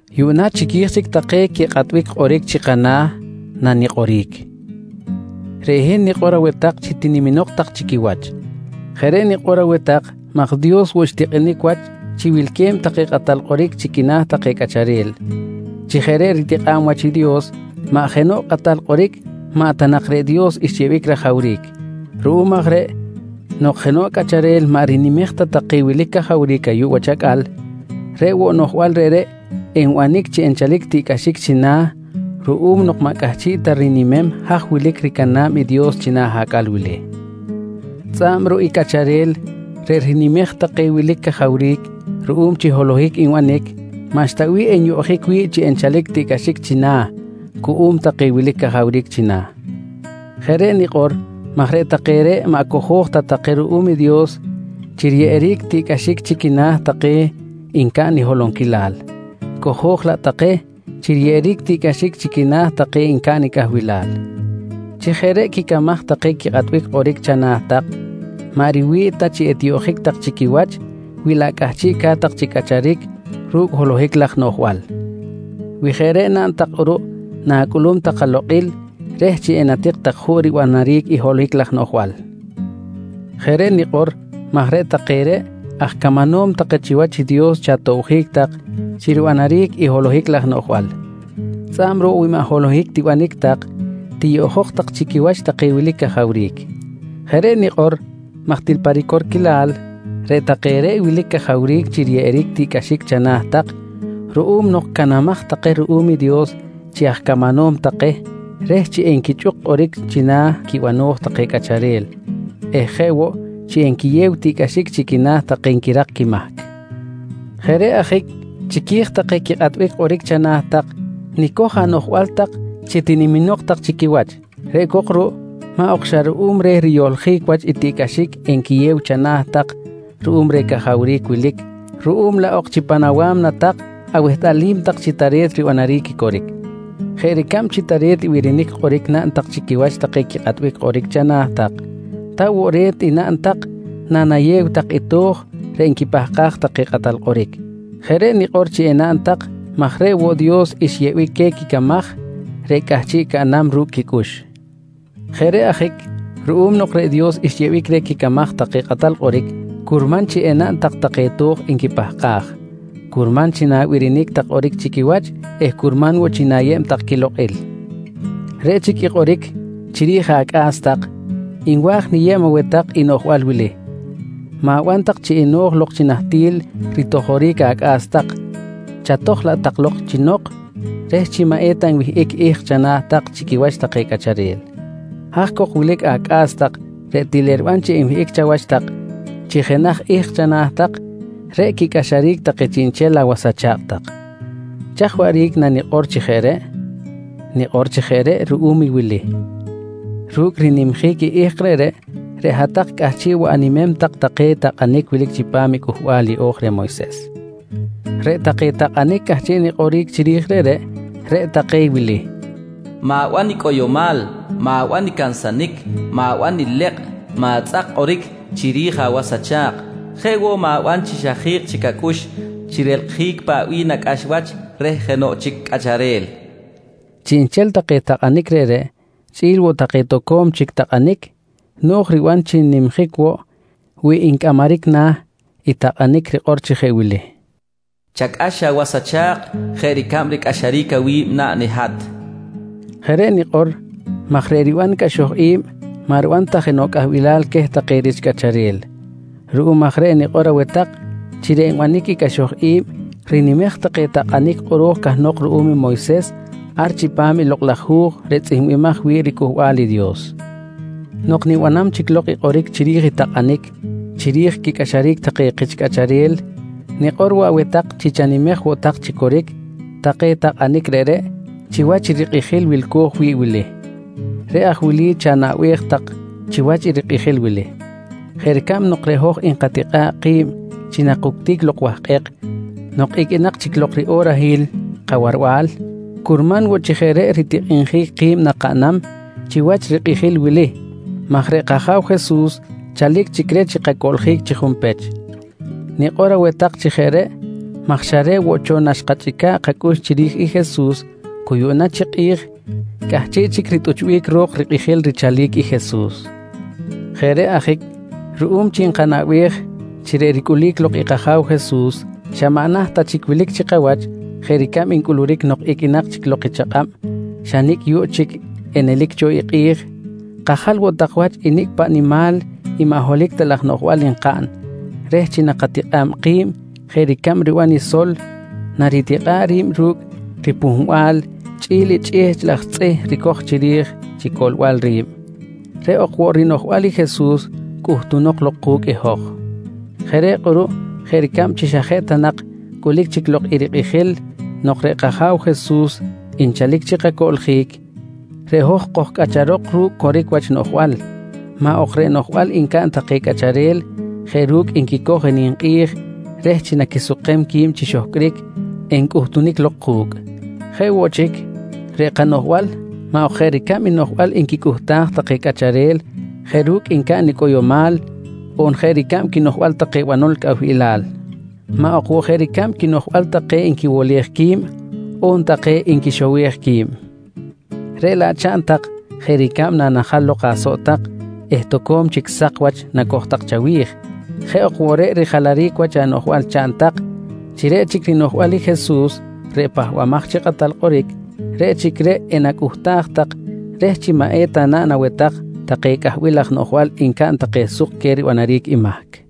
Yuꞌna chiqui̱j chic take quikꞌatbic kꞌoric chana̱ tak nanikꞌoric. Reꞌ hin nikꞌor aweh tak chi tiniminok tak chi quiwach. Jeꞌ reꞌ nikꞌor aweh tak maj woꞌ Dios xtikꞌinic wach chi wilque̱b take kꞌatal kꞌoric chi quina̱ take cꞌacharel. Chi jeꞌ reꞌ ritikꞌa̱b wach i Dios, maꞌ jenoꞌ kꞌatal kꞌoric maꞌ ta nak reꞌ Dios xyeꞌbic rajawric. Ruꞌum aj reꞌ nok jenoꞌ cꞌacharel maꞌ rinimej ta take wilic cajawric ayuꞌ wach acꞌal, reꞌ woꞌ noꞌjbal reꞌreꞌ enbanic chi enchalic tiꞌcꞌaxic china̱ ruꞌum nok maꞌ cꞌahchiꞌ ta rinimem haj wilic ricana̱b i Dios china̱ acꞌal wili. Tzꞌa̱b ruꞌ i cꞌacharel reꞌ rinimej take wilic cajawric ruꞌum chi holohic nbanic, maꞌxta bih enyoꞌjic wi̱ꞌ chi enchalic tiꞌcꞌaxic china̱ cuꞌum take wilic cajawric china̱. Jeꞌ reꞌ nikꞌor maj reꞌ take reꞌ maꞌ cojo̱j ta take ruꞌum i Dios chi riyeꞌeric tiꞌcꞌaxic chi quina̱ take ncaꞌn i holonquilal, cojo̱j laꞌ take chi riyeꞌeric tiꞌcꞌaxic chi quina̱ take ncaꞌn i cꞌahbilal. Chi jeꞌ reꞌ quicamaj take quikꞌatbic kꞌoric chana̱ tak, maꞌ riwi̱ꞌ ta chi etiyoꞌjic tak chi quiwach wi laꞌ cꞌahchiꞌca̱t chi cꞌacharic ru̱cꞌ holohic laj noꞌjbal. Wi jeꞌ reꞌ naꞌn tak kꞌuruꞌ, na̱cꞌulum tak alokꞌil reh chi enatik tak juꞌ ribanaric i holohic laj noꞌjbal. Jeꞌ reꞌ nikꞌor maj reꞌ take reꞌ aj camanom take chiwach i Dios chi atobjic tak chi ribanaric i holohic laj noꞌjbal. Tzꞌa̱b ruꞌ wi maꞌ holohic tibanic tak, tiyoꞌjok tak chi quiwach take wilic cajawric. Jeꞌ reꞌ nikꞌor maj til pa ricorquilal, reꞌ take reꞌ wilic cajawric chi riyeꞌeric tiꞌcꞌaxic chana̱ tak ruꞌum nok canamaj take ruꞌum i Dios chi aj camanom take reh chi enquichꞌuk kꞌoric china̱ quibano̱j take cꞌacharel eh jeꞌ woꞌ chi enquiyew tiꞌcꞌaxic chi quina̱ take nquirak quimahc. Jeꞌ reꞌ ajic chiqui̱j take quikꞌatbic kꞌoric chana̱ tak, nicoj anoꞌjbal tak chi tiniminok tak chi quiwach. Reꞌ cok ruꞌ maꞌ ok xa ruꞌum reh riyohljic wach i tiꞌcꞌaxic enquiyew chana̱ tak ruꞌum reh cajawric wilic, ruꞌum laꞌ ok chi pan awa̱mna tak awehtꞌalim tak chi tare̱t ribanaric i coric. Jeꞌ ricab chi tare̱t i birinic kꞌoric naꞌn tak chi quiwach take quikꞌatbic kꞌoric chana̱ tak, ta woꞌ re̱t i naꞌn tak nanayew tak i to̱j reꞌ nquipahkaj take kꞌatal kꞌoric. Jeꞌ reꞌ nikꞌor chi enaꞌn tak maj reꞌ woꞌ Dios xyeꞌbic queh quicamaj reꞌ cꞌahchiꞌ caꞌnam ru̱cꞌ quicꞌux. Jeꞌ reꞌ ajic ruꞌum nok reꞌ Dios xyeꞌbic reh quicamaj take kꞌatal kꞌoric, curman chi enaꞌn tak take to̱j nquipahkaj, curman chi na̱birinic tak kꞌoric chi quiwach eh curman woꞌ chi na̱yeb tak quilokꞌil. Reꞌ chic i kꞌoric chiri̱j acꞌa̱s tak, nwa̱j niyeb aweh tak i noꞌjbal wili: Ma̱ban tak chi eno̱j lok chi nahtil ritojoric acꞌa̱s tak, chatoj laꞌ tak lok chi nok reh chi maꞌ eta nwihꞌic i ihk chana̱ tak chi quiwach take cꞌacharel. Haj cok wilic acꞌa̱s tak reꞌ til eriban chi enwihꞌic chawach tak chi jenaj ihk chana̱ tak, reꞌ quicꞌaxaric take chiꞌnchel awas acha̱kꞌ tak. Chaj waꞌric nanikꞌor chi jeꞌ reꞌ? Nikꞌor chi jeꞌ reꞌ ruꞌum i wili: Ru̱cꞌ rinimjic i ihk reꞌreꞌ, reꞌ hat-tak cꞌahchiꞌ woꞌ animem tak take takꞌanic wilic chipam i Cꞌuhbal Yeꞌo̱j reh Moyses. Reꞌ take takꞌanic cꞌahchiꞌ nikꞌoric chiri̱j reꞌreꞌ, reꞌ take wili: Ma̱ban i cꞌoyomal, ma̱ban i cansanic, ma̱ban ilekꞌ, ma̱tzꞌak kꞌoric chiri̱j awas acha̱kꞌ. Jeꞌ woꞌ ma̱ban chi xa ji̱kꞌ chic acꞌux chi relkꞌjic paꞌ bih nacꞌax wach reh jenoꞌ chic cꞌacharel. Chiꞌnchel take takꞌanic reꞌreꞌ chꞌi̱l woꞌ take toco̱m chic takꞌanic no̱j riban chi n-nimjic woꞌ wi ncꞌamaric na̱ i takꞌanic rikꞌor chi jeꞌ wili: “Chacꞌax awas acha̱kꞌ jeꞌ ricab ricꞌaxaric awi̱b naꞌn i hat”. Jeꞌ reꞌ nikꞌor maj reꞌ riban cꞌaxoj i̱b maꞌ riban ta jenoꞌ cꞌahbilal queh take rich cꞌacharel. Ruꞌum aj reꞌ nikꞌor aweh tak chi reꞌ nbanic i cꞌaxoj i̱b rinimej take takꞌanic kꞌoro̱j cahnok ruꞌum i Moyses ar chipam i Lokꞌ laj Hu̱j reꞌ tzꞌihmbimaj wi̱ꞌ riCꞌuhbal i Dios. Nok nibanam chic lok kꞌoric chiri̱j i takꞌanic chiri̱j quicꞌaxaric take kich cꞌacharel, nikꞌor woꞌ aweh tak chi chanimej woꞌ tak chi coric take takꞌanic reꞌreꞌ chiwach i rikꞌijil wilco̱j wi̱ꞌ wili. Reꞌ aj wili chanaꞌbej tak chiwach i rikꞌijil wili: Jeꞌ ricab nok reꞌ hoj nkatikꞌa̱ꞌ ki̱b chi nakuctic lok wahkꞌek nok iqꞌuinak chic lok riꞌorahil kawarbal, curman woꞌ chi jeꞌ reꞌ ritikꞌinjic ki̱b nakaꞌnam chiwach rikꞌijil wili maj reꞌ kAja̱w Jesus chalic chic reh chi kacoꞌljic chi junpech. Nikꞌor aweh tak chi jeꞌ reꞌ maj xa reꞌ woꞌ cho naxkachꞌica̱ꞌ kacꞌux chiri̱j i Jesus cu yuꞌna chi kꞌi̱j cꞌahchiꞌ chic ritꞌuchbic ro̱k rikꞌijil richalic i Jesus. Jeꞌ reꞌ ajic ruꞌum chi nkanaꞌbej chi reꞌ ricꞌulic lok i kAja̱w Jesus xa maꞌ naht ta chic wilic chi kawach jeꞌ ricab ncꞌuluric nok iqꞌuinak chic lok i chakꞌab xa nicꞌ yuꞌ chic enelic cho i kꞌi̱j, kajal woꞌ tak wach i nicꞌ paꞌ nimal i maꞌ holohic ta laj noꞌjbal nkaꞌn reh chi nakatikꞌa̱b ki̱b jeꞌ ricab riban i sol naritikꞌa̱ꞌ ri̱b ru̱cꞌ ripuhmbal chꞌi̱l i chꞌihchꞌ laj tzꞌih ricoj chiri̱j chi coꞌlbal ri̱b, reꞌ ok woꞌ rinoꞌjbal i Jesus cꞌuhtunok lok ku̱cꞌ i hoj. Jeꞌ reꞌ kꞌuruꞌ jeꞌ ricab chi xa jeꞌ ta nak cꞌulic chic lok i rikꞌijil nok reꞌ kAja̱w Jesus nchalic chi kacoꞌljic, reꞌ hoj kojcꞌacharok ru̱cꞌ coric wach noꞌjbal maꞌ ok reꞌ noꞌjbal ncaꞌn take cꞌacharel jeꞌ ru̱cꞌ nquicoj ninkꞌi̱j reh chi naquisukem qui̱b chi xohcꞌric, encꞌutunic lok ku̱cꞌ. Jeꞌ woꞌ chic, reꞌ kanoꞌjbal maꞌ ok jeꞌ ricab i noꞌjbal nquicꞌuhtaj take cꞌacharel jeꞌ ru̱cꞌ ncaꞌn i cꞌoyomal, on jeꞌ ricab quinoꞌjbal take banol cꞌahbilal. Maꞌ ok woꞌ jeꞌ ricab quinoꞌjbal take nquiwolej qui̱b, on take nquixowej qui̱b. Reꞌ laꞌ chaꞌn tak jeꞌ ricab nanajal lok asoꞌ tak eh toco̱m chic sak wach nacoj tak chawi̱j, jeꞌ ok woꞌ reꞌ rijalaric wach anoꞌjbal chaꞌn tak chi reꞌ chic i rinoꞌjbal i Jesus reꞌ Pahbamaj chi Kꞌatal Kꞌoric, reꞌ chic reꞌ enacꞌuhtaj tak reh chi maꞌ eta naꞌn aweh tak take cꞌahbil laj noꞌjbal ncaꞌn take suk queh ribanaric i mahc.